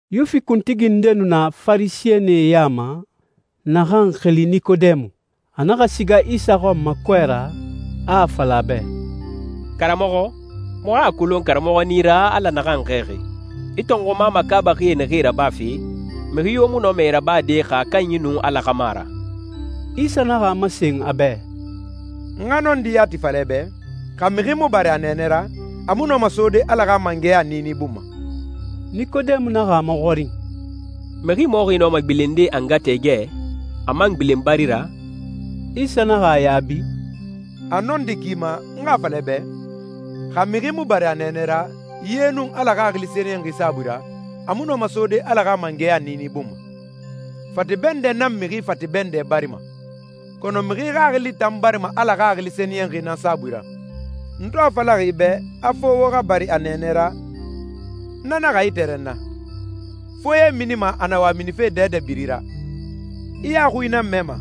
Yuwifi kuntigi nde nu na Farisɛnie ya ma, naxan xili Nikodemu. A naxa siga Isa xɔn ma kɔɛ ra, a a fala a bɛ, «Karamɔxɔ, muxu a kolon karamɔxɔ nan i ra Ala naxan xɛɛxi. I tɔnxuma makaabaxi naxee rabafe, mixi yo mu nɔma e rabade xa a kanyi nun Ala xa mu a ra.» Isa naxa a masen a bɛ, «N xa nɔndi yati fala i bɛ, xa mixi mu bari a nɛɛnɛ ra, a mu nɔma sode Ala xa mangɛya niini bun ma.» Nikodemu naxa a maxɔrin, «Mixi mɔxi nɔma gbilende a nga tɛɛgɛ, a man gbilen bari ra?» Isa naxa a yaabi, «A nɔndi i ma n xa a fala i bɛ, xa mixi mu bari a nɛɛnɛ ra, ye nun Ala Xaxili Sɛniyɛnxi saabui ra, a mu nɔma sode Ala xa mangɛya niini bun ma.» «Fate bɛndɛ nan mixi fate bɛndɛ barima. Kɔnɔ mixi xaxili tan barima Ala Xaxili Sɛniyɛnxi nan saabui ra. N to a falaxi i bɛ a fo wo xa bari a nɛɛnɛ ra, na naxa i tɛrɛnna. Foye minima a na wa minife dɛdɛ biri ra. I a xui nan mɛma,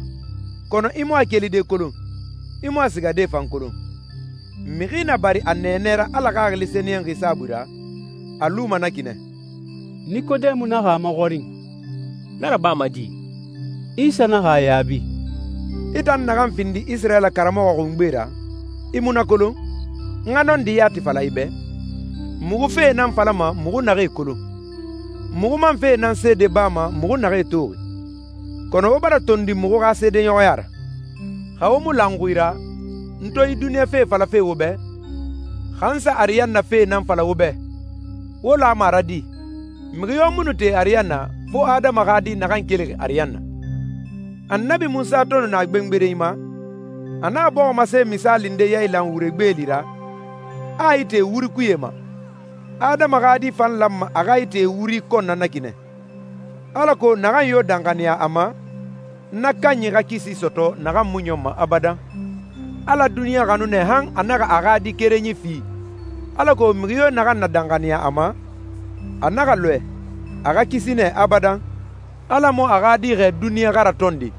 kɔnɔ i mu a kelide kolon, i mu a sigade fan kolon. Mixi na bari a nɛɛnɛ ra Ala Xaxili Sɛniyɛnxi saabui ra, a luma na ki nɛ.» Nikodemu naxa a maxɔrin, «Na rabama di?» Isa naxa a yaabi, «I tan naxan findixi Isirayila karamɔxɔ xungbe ra, i mu na kolon? N xa nɔndi yati fala i bɛ, muxu fee nan falama muxu naxee kolon. Muxu man fee nan seede bama muxu naxee toxi, kɔnɔ wo bara tondi muxu xa seedeɲɔxɔya ra. Xa wo mu la n xui ra, n to yi duniɲa fee falafe wo bɛ, xa n sa ariyanna fee nan fala wo bɛ, wo lama a ra di? Mixi yo mu nu te ariyanna, fo Adama xa Di naxan kelixi ariyanna.» «Annabi Munsa to nu na gbengberenyi ma, a naxa bɔximase misaali nde yailan wure gbeeli ra, a a ite wuri kuye ma. Adama xa Di fan lanma a xa ite wuri kɔn na na ki nɛ, alako naxan yo danxaniya a ma, na kanyi xa kisi sɔtɔ naxan mu ɲɔnma abadan. Ala duniɲa xanu nɛ han a naxa a xa Di kerenyi fi, alako mixi yo naxan na danxaniya a ma, a naxa lɔɛ, a xa kisi nɛ abadan. Ala mu a xa Di xɛɛ duniɲa xa ratɔnde,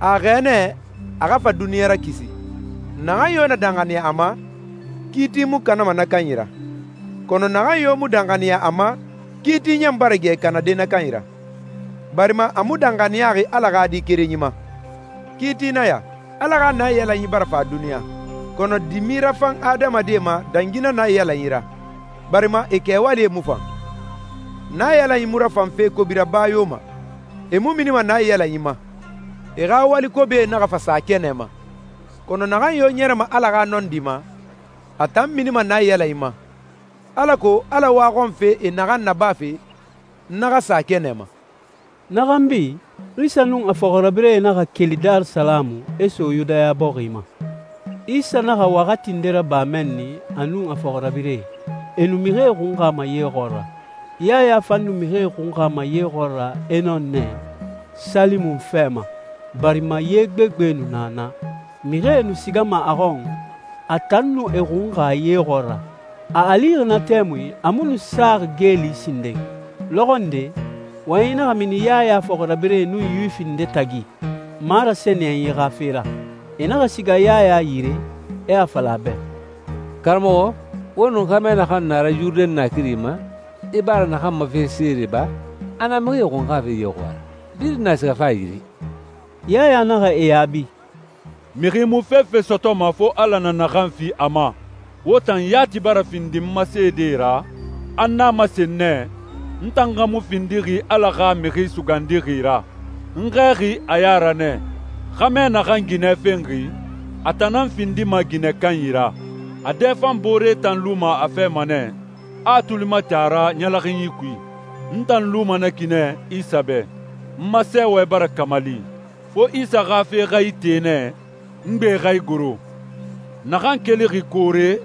a a xɛɛ nɛ a xa fa duniɲa rakisi. Naxan yo na danxaniya a ma, kiiti mu kanama na kanyi ra, kɔnɔ naxan yo mu danxaniya a ma, kiiti ɲan bara gɛ kanade na kanyi ra, barima a mu danxaniyaxi Ala xa Di kerenyi ma. Kiiti nan ya: Ala xa naiyalanyi bara fa duniɲa, kɔnɔ dimi rafan adamadie ma dangi na naiyalanyi ra, barima e kɛwali mu fan. Naiyalanyi mu rafan fe kobi raba yo ma. E mu minima naiyalanyi ma, e xa wali kobie naxa fa sa kɛnɛ ma. Kɔnɔ naxan yo ɲɛrɛma Ala xa nɔndi ma, a tan minima naiyalanyi ma, alako Ala waxɔnfe e naxan nabafe, na xa sa kɛnɛ ma.» Na xanbi, Isa nun a fɔxirabirɛe naxa keli Darisalamu e so Yudaya bɔxi ma. Isa naxa waxati nde raba mɛnni a nun a fɔxirabirɛe, e nu mixie xunxama ye xɔɔra. Yaya fan nu mixie xunxama ye xɔɔra Enon nɛ, Salimon fɛ ma, barima ye gbegbe nu na naa. Mixie nu sigama a xɔn, a tan nu e xunxa ye xɔɔra. A a lixi na tɛmui, a mu nu saxi geeli sinden. Lɔxɔ nde, wɔyɛnyi naxa mini Yaya fɔxirabirɛe nun Yuwifi nde tagi marasɛniyɛnyi xa fe ra. E naxa siga Yaya yire, e a fala a bɛ, «Karamɔxɔ, wo nun xɛmɛ naxan nu a ra Yurudɛn naakiri ma, i bara naxan ma fe seede ba, a na mixie xunxafe ye xɔɔra. Birin na sigafe a yire.» Yaya naxa e yaabi, «Mixi mu fefe sɔtɔma, fo Ala na naxan fi a ma. Wo tan yati bara findi n ma seedee ra, a n a masen nɛ, ‹N tan xa mu findixi Ala xa Mixi Sugandixi ra. N xɛɛxi a ya ra nɛ.› Xɛmɛ naxan ginɛ fenxi, a tan nan findima ginɛ kanyi ra. A dɛfanboore tan luma a fɛ ma nɛ, a a tuli mati a ra ɲɛlɛxinyi kui. N tan luma na ki nɛ Isa bɛ. N ma sɛɛwɛ bara kamali. Fo Isa xa fe xa ite nɛ, n gbe xa igoro.» «Naxan kelixi koore,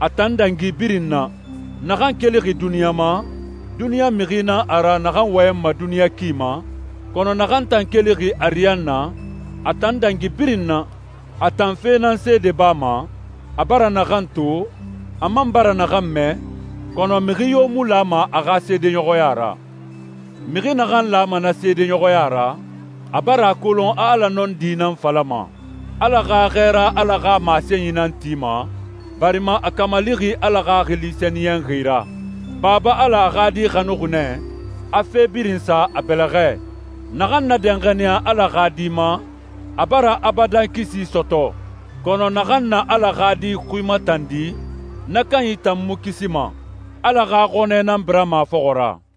a tan dangi birin na. Naxan kelixi duniɲa ma, duniɲa mixi nan a ra naxan wɔyɛnma a duniɲa ki ma, kɔnɔ naxan tan kelixi ariyanna, a tan dangi birin na. A tan fe nan seede bama, a bara naxan to, a man bara naxan mɛ, kɔnɔ mixi yo mu lama a xa seedeɲɔxɔya ra. Mixi naxan lama na seedeɲɔxɔya ra, a bara a kolon a Ala nɔndi nan falama. Ala xa Xɛɛra Ala xa masenyi nan tima, barima a kamalixi Ala Xaxili Sɛniyɛnxi ra. Baba Ala a xa Di xanuxi nɛ, a fe birin sa a bɛlɛxɛ. Naxan na danxaniya Ala xa Di ma, a bara abadan kisi sɔtɔ. Kɔnɔ naxan na Ala xa Di xui matandi, na kanyi tan mu kisima. Ala xa xɔnɛ nan birama a fɔxɔ ra.»